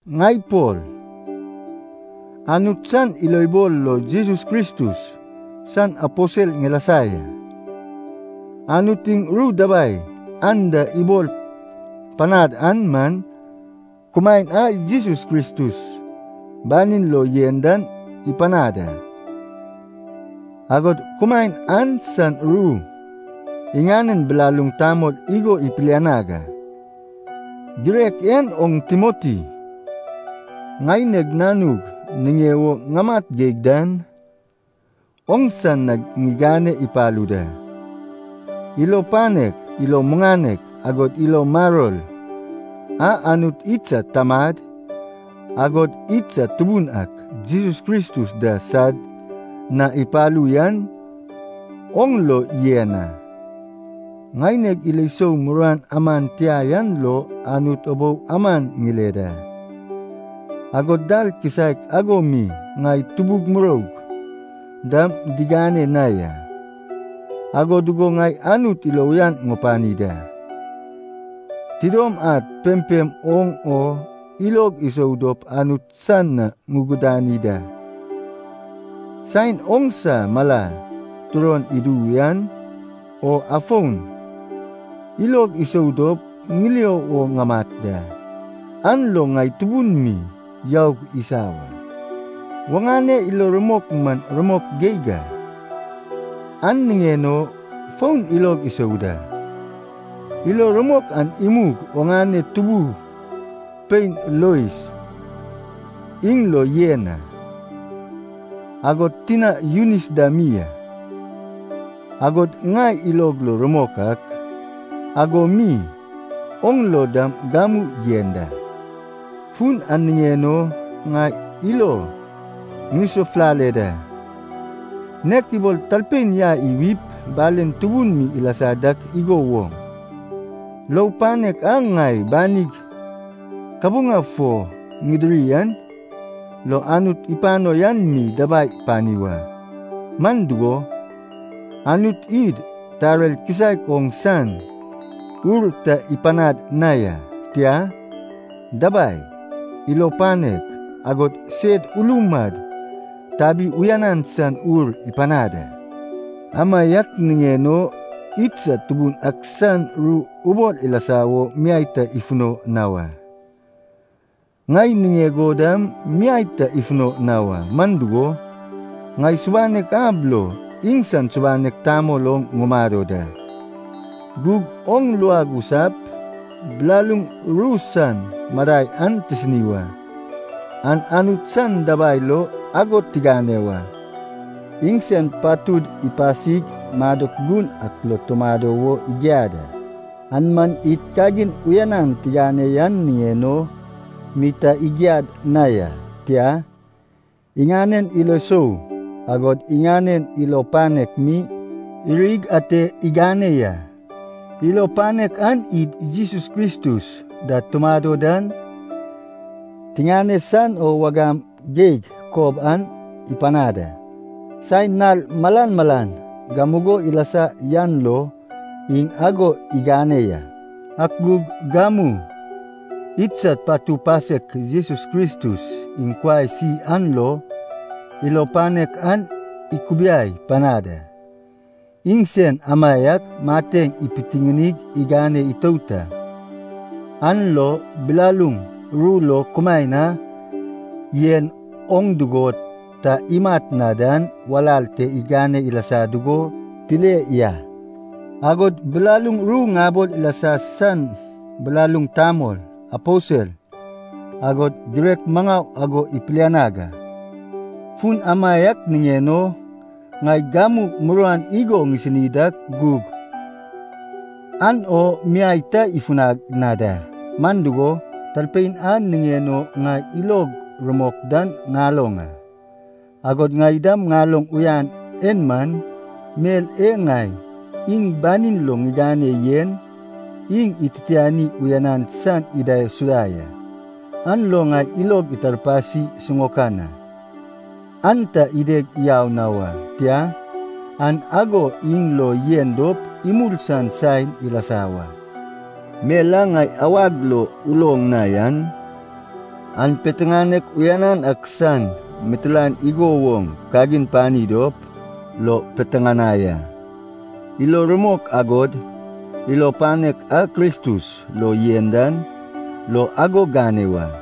Ŋai Pol, Anut san ilobol lo Jesus Kristus san aposel ŋilasa ya. Anut iŋ ru dabai anda ibol panad an man, kumaen a Jesus Kristus banin lo yen dan ipanad a. Agod kumaen an san ru iŋanen bilaluŋ tamol igo ipilianag a. Girek en oŋ Timoti, ŋaineg nanug niŋe wo ŋamat geig dan, oŋsa na ŋigane ipalu da. Ilo panek, ilo muŋanek, agod ilo maror a Anut idsad Tamad, agod idsad Tubun ak Jesus Kristus da sad na ipalu yan oŋ lo yen a. Ŋaineg ilo sou muruan aman tia yan lo Anut ubou aman ŋile da, agod dal kisaek ago mi ŋai tubug muroug dam digane na ya. Ago dugo ŋai Anut ilo uyan ŋupani da, tidom ad pempem oŋ o ilog isou dop Anut san na ŋugudani da. Saen oŋsa mala turon idu yan o afon ilog isou dop ŋilio wo ŋamat da, an lo ŋai tubun mi youg isa wa. Oŋane ilo rumok man rumok geig a, an niŋen o fon ilog isou da. Ilo rumok an imug oŋane tubu pein Lois iŋ lo yen a, agod tina Yunis da mi, agod ŋai ilog lo rumok ak, ago mi oŋ lo dam gamu yen da. Fun an niŋen o, ŋai ilo ŋisafulale da. Nek ibol talpein yai iwip balen tubun mi ilasa dak igo woŋ, lou panek a ŋai banig kabuŋa fo ŋidiri an lo Anut ipano yan mi dabai pani wa. Man dugo, Anut id tarer kisaek oŋ san ur ta ipanad na ya. Tia, dabai, ilo panek, agod sed ulum ad tabi uyanan san ur ipanad a. Amaiak niŋen o, idsad Tubun ak san ru ubol ilasa wo miai ta ifuno na wa. Ŋai niŋeg o dam miai ta ifuno na wa, man dugo, ŋai subanek ab lo iŋsan subanek tamol oŋ ŋumado da. Gug oŋ luag usap bilaluŋ ru san madai an tisini wa, an Anut san dabai lo ago tigane wa. Iŋsen patud ipasig madok gun ak lo tumado wo igiad a. An man id kagin uyanan tigane yan niŋen o mi ta igiad na ya, tia, iŋanen ilo sou agod iŋanen ilo panek mi irig ate igane ya. Ilo panek an id Jesus Kristus da tumado dan tiŋane san o wagam geig kob an ipanad a, saen nal malan malan gamugo ilasa yan lo iŋ ago igane ya. Ak gug gamu idsad patu pasek Jesus Kristus iŋ kuai isi an lo ilo panek an ikubiai panad a. Iŋsen amaiak mateŋ ipitiŋinig igane itout a. An lo bilaluŋ ru lo kumaen a yen oŋ dugo ta imat na dan walal te igane ilasa dugo tile ya. Agod bilaluŋ ru ŋabol ilasa san bilaluŋ tamol, aposel, agod girek maŋau ago ipilianag a. Fun amaiak niŋen o ŋai gamu muruan igo ŋisini dak gug an o miai ta ifunag na da. Man dugo, Talpein a niŋen o ŋai ilog rumok dan ŋaloŋ a. Agod ŋai dam ŋaloŋ uyan en man, mel e ŋai iŋ banin lo ŋigane yen, iŋ ititiani uyanan san idaisuda ya. An lo ŋai ilog itarpasi siŋaokan a, an ta ideg yau na wa. Tia, an ago iŋ lo yen dop imul san saen ilasa wa. Mel a ŋai awag lo uloŋ na yan, an piteŋanek uyanan ak san mitilaen igo woŋ kagin pani dop lo piteŋanai a. Ilo rumok agod ilo panek a Kristus lo yen dan lo ago gane wa.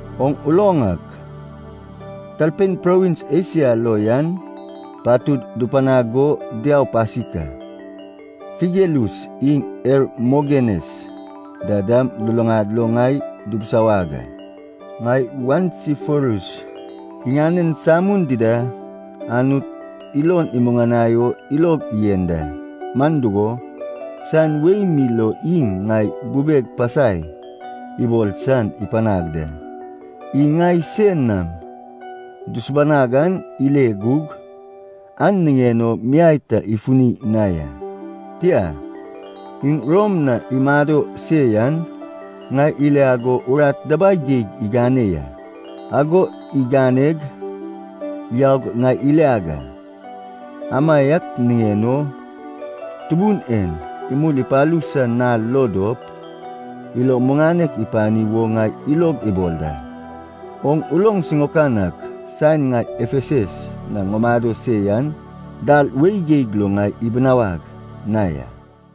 Oŋ uloŋ ak, talpein provins Esia lo yan patud dupanag go diau pasik a, Figelus iŋ Hermogenes da dam luluŋad lo ŋai dubusawag a. Ŋai Onesiforus iŋanen samun dida Anut ilon imuŋanai o ilog yen da. Man dugo, saen wei mi lo iŋ ŋai bubeg pasai ibol san ipanag da, iŋ ŋai sein nam dusubanag an ile gug, an niŋen o miai ta ifuni na ya. Tia, iŋ Rom na imado se yan, ŋai iliag o urat dabai geig igane ya. Ago iganeg yaug ŋai iliag a. Amaiak niŋen o, Tubun en imul ipalu san nal lo dop ilo muŋanek ipani wo ŋai ilog ibol da. Oŋ uloŋ siŋaokan ak saen ŋai Efesus na ŋumado se yan, dal wei geig lo ŋai ibinawag na ya.